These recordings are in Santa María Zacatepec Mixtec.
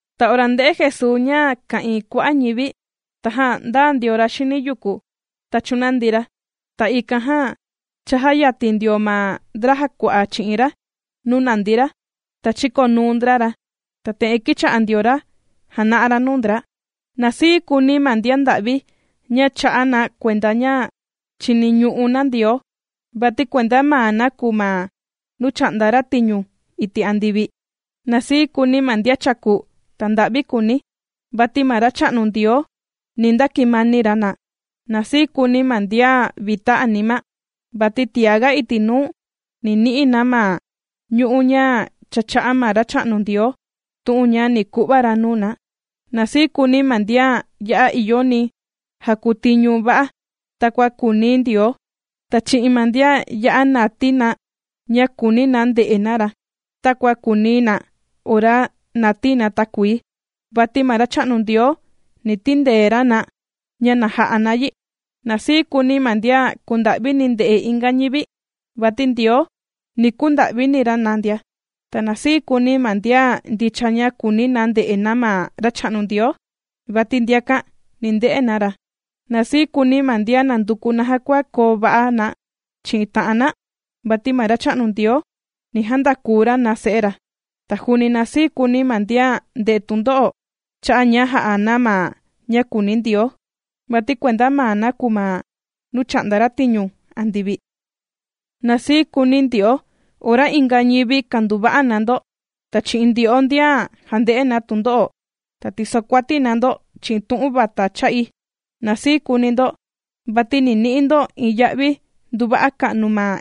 Ta ora ndē'e Jesuu ña ka'ìin kua'a' ñivi, tajan ndāa ndio ra xini yuku, ta chūnandi ra. Ta ikan jan chājayatin ndio ma ndra jàkua'a chi'in ra nuu nàndi ra, ta chīkonuu ndra ra, ta te'en kīcha'a ndio ra jàna'a ra nuu ndra: ―Na sii kuuni ma ndian nda'vi ña chà'a na kuenda ña chìniñu'u na Ndioo, vati kuenda maa na kùu ma nuu chà'nda ra tiñu iti' andivi. ’Na sii kuuni ma ndian chàku ta nda'vi kùuni, vati ma Racha'nu Ndioo ni ndakimani ra na. ’Na sii kuuni ma ndian vita anima, vati tiaga iti' nuu, ni ni'i na ma ñu'u' ña cha chā'a ma Racha'nu Ndioo tu'un ña ni ku'va ra nuu na. ’Na sii kuuni ma ndian ya'a ìyoni jàkuu tiñu va'a takua kùuni Ndioo, ta chi'in ma ndian ya'a nàtii na ña kùuni na nde'e na ra, takua kùuni na ora nàtii na takuii, vati ma Racha'nu Ndioo, ni tindee ra na ña na ja'a na yi. ’Na sii kuuni ma ndian kùnda'vini nde'e inga ñivi, vati Ndioo, ni kunda'vini ra na ndia. ’Ta na sii kuuni ma ndian ndicha ña kùuni na nde'e na ma Racha'nu Ndioo, vati ndiakan ni nde'e na ra. ’Na sii kuuni ma ndian nànduku naja kua koo va'a na chi'in ta'an na, vati ma Racha'nu Ndioo ni jandakuu ra na se'e ra. ’Ta juuni na sii kuuni ma ndian ndè'e tundo'o, cha'a' ña jà'a na ma ña kùuni Ndioo, vati kuenda maa na kùu ma nuu chà'nda ra tiñu andivi. ’Na sii kuuni ndyo'o ora inga ñivi kanduva'a na ndo, ta chi'in ndyo'o ndian jànde'e na tundo'o, ta tisokuati na ndo chi'in tu'un vata cha'i. Na sii kuuni ndo, vati ni ni'i ndo iin ya'vi nduva'a ka'nu ma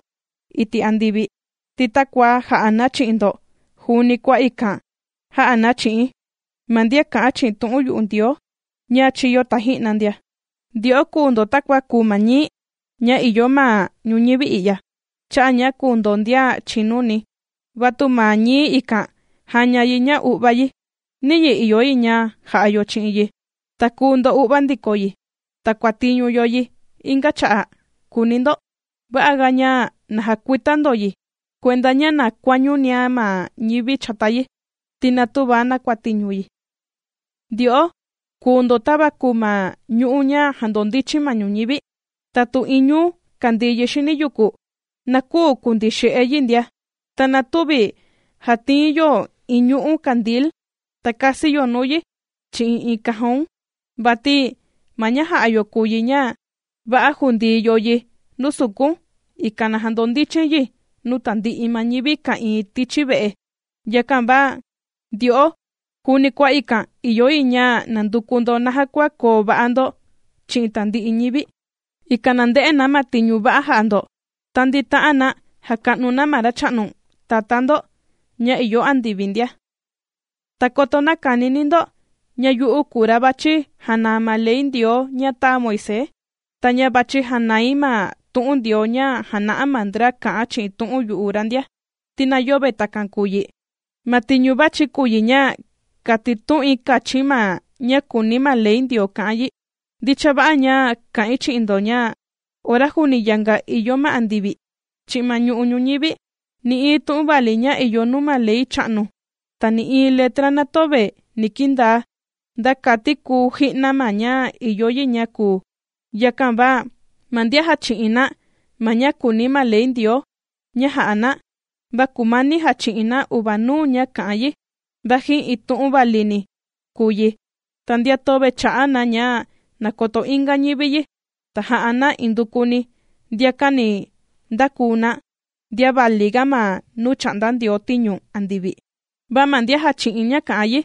iti' andivi, ti takua jà'a na chi'in ndo, juuni kua ikan jā'a na chi'in ma ndian kā'an chi'in tu'un yu'u Ndioo ña chīyo taji'na ndia. ’Ndyo'o kùu ndo takua kùu ma ñií ña ìyo ma ñuñivi i'ya, cha'a' ña kùu ndo ndian chìnuni. Va tu ma ñií ikan jàña yi ña u'vá yi, ¿niyi ìyo yi ña ja'a yo chi'in yi, ta kùu ndo'uva ndiko yi, ta kuàtiñu yo yi inga cha'a'?, kùuni ndo. Va'aga ña na jakuita ndo yi kuenda ña na kuañunia ma ñivi chata yi, ti na tüva nakutiñu yi. ’Ndyo'o kùu ndo tava kùu ma ñu'ú ña jàndondichin ma ñuñivi. Ta tu iin ñuu kàndii yi xini yuku, na küu kundii xe'e yi ndia. Ta na tüvi jàtiin yo iin ñu'ú kandil, ta kasi yo nuu yi chi'in iin cajon, vati ma ña jà'a yo kùu yi ña, va'a jùndii yo yi nuu sukun, ikan na jandondichin yi nuu tandi'i ma ñivi ka'ìin tichi ve'e. Yakan va ndyo'o juuni kua ikan ìyo yi ña nanduku ndo naja kua koo va'a ndo chi'in tandi'i ñivi, ikan na nde'e na ma tiñu va'a jà'a ndo, ta ndita'an na jàka'nu na ma Racha'nu Tatá ndo ña ìyo andivi ndia. ’Ta koto näkanini ndo, ña yu'u kùu ra vàchi janaa ma ley Ndioo ña tāa Moisés, ta ña vàchi janai ma tu'un Ndioo ña jàna'a ma ndra kà'an chi'in tu'un yu'u ra ndia, ti na yöve takan kùu yi. Ma tiñu vàchi̱ kùu yi ña, kàtitu'un kachi̱n ma ña kùuni ma ley Ndioo ka'an yi. Ndicha va'a ña kà'in chi'in ndo ña, ora juuni yanga ìyo ma andivi, chi'in ma ñu'u' ñuñivi, nï'iin tu'un vali ña ìyo nuu ma ley cha'nu, ta nï'iin letra na töve ni kindaa, nda kati kuu ji'na ma ña ìyo yi ña kuu. Yakan va ma ndian jàchi'in na ma ña kùuni ma ley Ndioo ña jà'a na, va kùmani jàchi'in na uvanuu ña kà'an yi, vaji iin tu'un valini kùu yi, ta ndian töve chà'a na ña na koto inga ñivi yi, ta jà'a na indukuni, ndiakan ni ndakuu na, ndian valiga ma nuu chà'nda Ndioo tiñu andivi. Va ma ndian jàchi'in ña kà'an yi,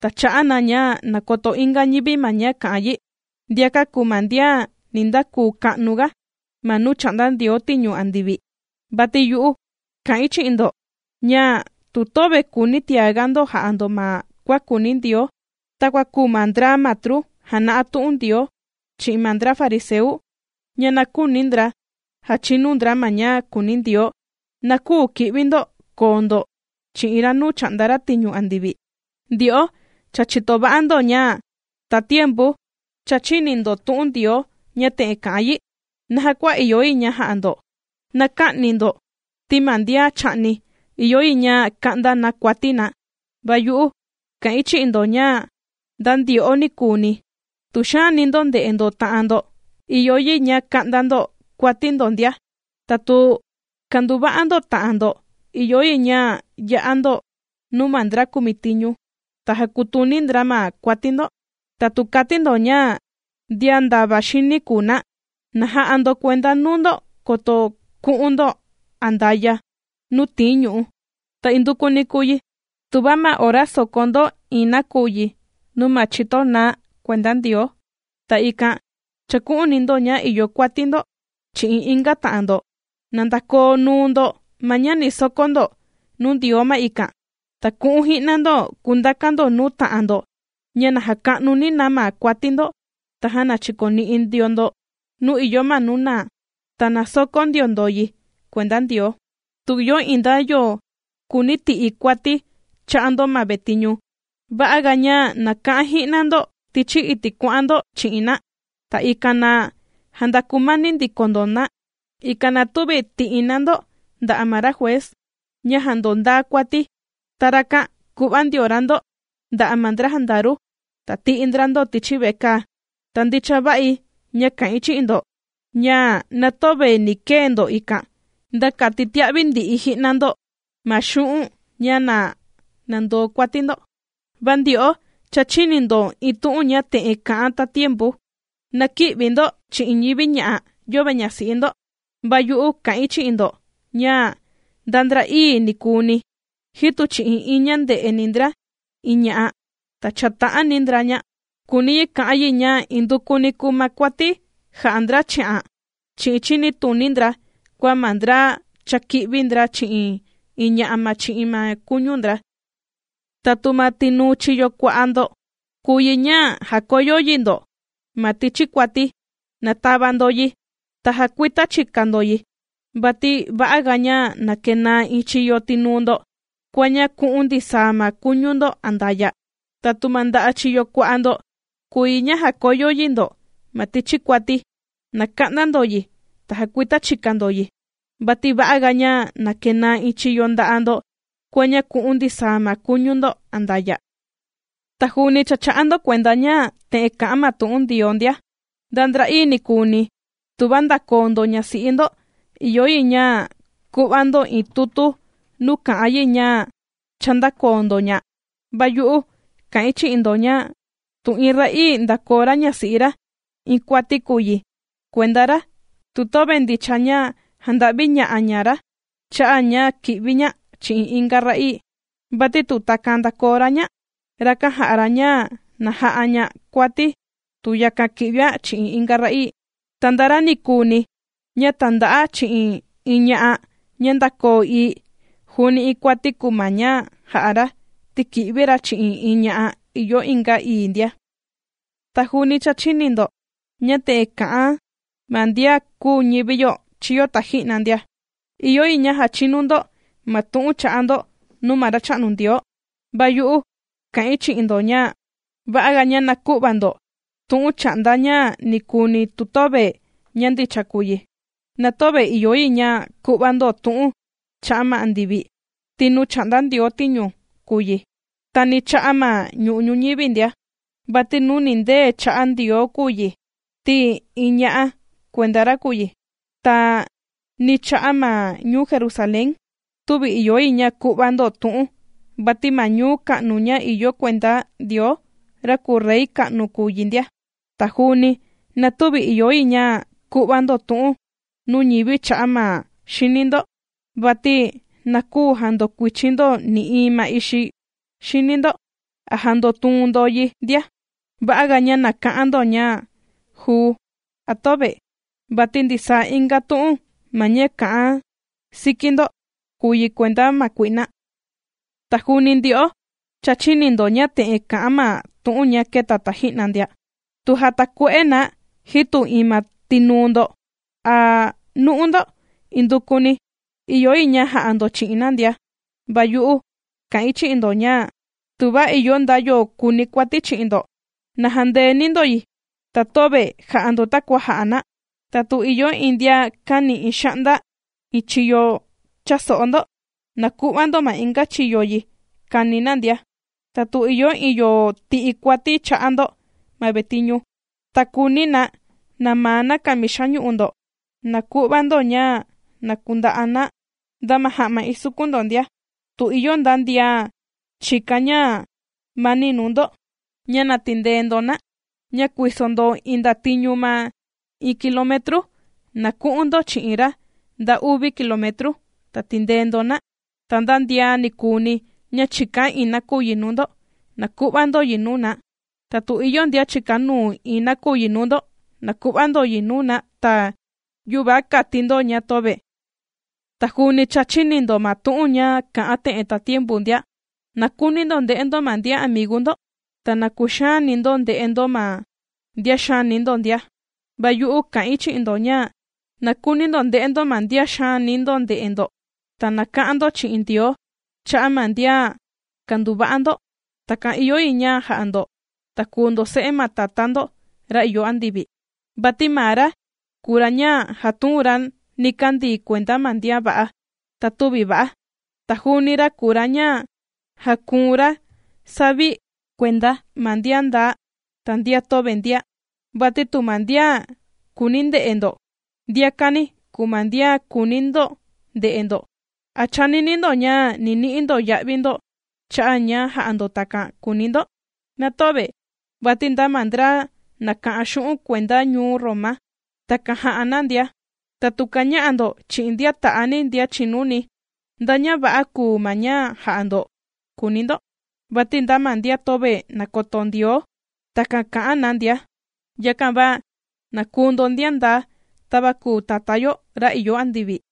ta chà'a na ña na koto inga ñivi ma ña kà'an yi, ndiakan kùu ma ndian ni ndakuu ka'nuga, ma nuu chà'nda Ndioo tiñu andivi. Vati yu'u kà'in chi'in ndo ña, tu töve kùuni tiaga ndo ja'a ndo ma kua kùuni Ndioo, takua kùu ma ndra matru jàna'a tu'un Ndioo chi'in ma ndra fariseu, ña na küuni ndra jàchinu ndra ma ña kùuni Ndioo, na küu ki'vi ndo koo ndo chi'in ra nuu chà'nda ra tiñu andivi. ’Ndyo'o cha chìto va'a ndo ña tatiempu cha chīni ndo tu'un Ndioo ña te'en kà'an yi naja kua ìyo yi ña ja'a ndo: “Na kä'ni ndo, ti ma ndian chà'ni ìyo yi ña ka'nda na kuati na.” Va yu'u kà'in chi'in ndo ña nda ndyo'o ni kùuni, tu xàani ndo nde'e ndo ta'an ndo, ìyo yi ña ka'nda ndo kuati ndo ndia. Ta tu kanduva'a ndo ta'an ndo ìyo yi ña ya'a ndo nuu ma ndra kumitiñu, ta jàkutuni ndra ma kuati ndo. Ta tu kàti ndo ña ndian ndava xini kùu na, na ja'a ndo kuenda nuu ndo koto ku'un ndo andaya' nuu tìin ñu'ú. ’Ta indukuni kùu yi tuva ma ora sokó ndo iin nakuyi nuu ma chito naá kuenda Ndioo, ta ikan chàku'uni ndo ña ìyo kuati ndo chi'in inga ta'an ndo, na ndakoo nuu ndo ma ña ni sokó ndo nuu Ndioo ma ikan, ta ku'un ji'na ndo kundakan ndo nuu ta'an ndo ña na jaka'nuni na ma kuati ndo, tajan na chikoni'i ndio ndo nuu ìyo ma nuu naa, ta na sokó ndio ndo yi kuenda Ndioo. ’Tu ìyo iin nda yo kùuni ti'i kuati cha'a' ndo ma vetiñu. Va'a ga ña na ka'an ji'na ndo tichi iti' kuà'an ndo chi'in na, ta ikan na jandakumani ndiko ndo na, ikan na tüvi tì'i na ndo nda'a' ma ra juez ña jàndondaa kuati, ta rakan ku'va ndio ra ndo nda'a' ma ndra jandaru, ta tì'i ndra ndo tichi vekaa. Ta ndicha va'i ña kà'in chi'in ndo ña na töve ni kee ndo ikan, nda kati tia'vi ndi'i ji'na ndo ma xu'un' ña na nandoo kuati ndo. ’Vati ndyo'o cha chīni ndo iin tu'un ña te'en kà'an tatiempu: “Na kï'vi ndo chi'in ñivi ña'a yöve ñasi'i ndo.” Va yu'u kà'in chi'in ndo, ña nda ndra'ii nikuuni, jitu chi'in iin ña ndè'eni ndra iin ña'a, ta chàta'ani ndra, ña kùuni yi ka'an yi ña indukuni kùu ma kuati jà'a ndra chi'an chi'in chinituni ndra kua ma ndra cha kī'vi ndra chi'in iin ña'a ma chi'in ma kuñu ndra. ’Ta tu ma tinuu chiyo kua'a' ndo kùu yi ña jàkoyo yi ndo ma tichi kuati, na tava ndo yi, ta jakuita chika ndo yi. Vati va'aga ña na kenaa iin chiyo tinuu ndo, kua ña ku'un ndisaa ma kuñu ndo andaya'. Ta tu ma nda'a' chiyo kua'a ndo kùu yi ña jàkoyo yi ndo ma tichi kuati, na ka'nda ndo yi, ta jakuita chika ndo yi. Vati va'aga ña na kenaa iin chiyo nda'a' ndo kua ña ku'un ndisaa ma kuñu ndo andaya'. ’Ta juuni cha chà'a ndo kuenda ña te'en kà'an ma tu'un Ndioo ndia: “Nda ndra'ii nikuuni tuva ndàkoo ndo ñasi'i ndo, ìyo yi ña ku'va ndo iin tutu nuu kà'an yi ña cha ndākoo ndo ña.” Va yu'u kà'in chi'in ndo ña tu iin ra'ii ndàkoo ra ñasi'i ra, iin kuati kùu yi kuenda ra tu töve ndicha ña jànda'viña'a ña ra cha'a' ña kì'vi ña chi'in inga ra'ii. Vati tu takan ndākoo ra ña, rakan jà'a ra ña na ja'a ña kuati tu yakan ki'vian chi'in inga ra'ii. Ta nda ra ni kùuni ña tànda'a chi'in iin ña'a ña ndākoo ii, juuni iin kuati kùu ma ña jà'a ra, ti kì'vi ra chi'in iin ña'a ìyo inga ii ndia. ’Ta juuni cha chīni ndo ña te'en kà'an ma ndian kūu ñivi yo chīyo taji'na ndia: “Ìyo yi ña jachinu ndo ma tu'un chà'a ndo nuu ma Racha'nu Ndioo”. Va yu'u kà'in chi'in ndo ña va'aga ña na kü'va ndo tu'un cha'a' nda ña nikuuni tu töve ña ndicha kùu yi. Na töve ìyo yi ña ku'va ndo tu'un cha'a' ma andivi, ti nuu chà'nda Ndioo tiñu kùu yi. Ta ni cha'a' ma ñu'u' ñuñivi ndia, vati nuu nìndee cha'a Ndioo kùu yi ti iin ña kuenda ra kùu yi. Ta ni cha'a' ma ñuu Jerusalén, tüvi ìyo yi ña ku'va ndo tu'un, vati ma ñuu ka'nu ña ìyo kuenda Ndioo, ra kùu Rey ka'nu kùu yi ndia. Ta juuni na tüvi ìyo yi ña ku'va ndo tu'un nuu ñivi cha'a' ma xini ndo, vati na küu jandokuichin ndo nï'iin ma ixi xini ndo, a jàndotuun ndo yi ndia. Va'aga ña na ka'an ndo ña: “juu” a “töve”, vati ndisaa inga tu'un ma ña kà'an siki ndo, kùu yi kuenda ma kui'na. ’Ta juuni ndyo'o cha chīni ndo ña te'en kà'an ma tu'un ña kēta taji'na ndia: “Tu jàtakue'e na jitu iin ma tinuu ndo a nu'u ndo, indukuni ìyo yi ña ja'a ndo chi'in na ndia.” Va yu'u kà'in chi'in ndo ña: tuva ìyo nda yo kùuni kuati chi'in ndo, na jandeeni ndo yi, ta töve jà'a ndo takua jà'a na. Ta tu ìyo iin ndian kàni iin xa'nda iin chiyo cha'a so'o ndo, na ku'va ndo ma inga chiyo yi kàni na ndia. Ta tu ìyo iin yo ti'i kuati cha'a' ndo ma vetiñu, ta kùuni na namaa na kamixa ñu'u ndo, na ku'va ndo ña na kunda'a na, nda ma ja'ma isukun ndo ndia. Tu ìyo nda ndian chìkan ñamani nuu ndo ña na tindee ndo na, ña kuìso ndo iin ndatiñu na iin kilometru, na ku'un ndo chi'in ra nda uvi kilometru, na tindee ndo na. Ta nda ndian nikuuni ña chìkan iin nakuyi nuu ndo, na ku'va ndo yi nuu na. Ta tu ìyo ndian chìkanuu iin nakuyi nuu ndo, na ku'va ndo yi nuu na, ta yüva kati ndo ña töve. ’Ta juuni cha chīni ndo ma tu'un ña kà'an te'en tatiempu ndia: “Na kuuni ndo nde'e ndo ma ndian amigu ndo, ta na kuxaani ndo nde'e ndo ma ndian xaani ndo ndia.” Va yu'u kà'in chi'in ndo ña: Na kuuni ndo nde'e ndo ma ndian xaani ndo nde'e ndo, ta na ka'an ndo chi'in Ndioo cha'a' ma ndian kànduva'a ndo. Takan ìyo yi ña ja'a ndo, ta kùu ndo se'e ma Tatá ndo ra ìyo andivi. Vati maa ra kùu ra ña jàtuun ra nikandii kuenda ma ndian va'a, ta tüvi va'a. Ta juuni ra kùu ra ña jàkuun ra savi kuenda ma ndian ndaa, ta ndian töve ndia. Vati tu ma ndian kùuni nde'e ndo, ndiakani kùu ma ndian kùuni ndo nde'e ndo, ¿a chànini ndo ña ni ni'i ndo ya'vi ndo cha'a' ña jà'a ndo takan?, kùuni ndo. Na töve, vati nda ma ndra nàka'an xu'un' kuenda ñuu Roma, takan jà'a na ndia. Ta tu kàña'a ndo chi'in ndian ta'ani ndian chìnuni, ¿nda ña va'a kùu ma ña jà'a ndo?, kùuni ndo. Vati nda ma ndian töve nàkoto Ndioo, takan kà'an na ndia. Yakan va na kuu ndo ndian ndaa, tava kùu ma Tatá yo ra ìyo andivi.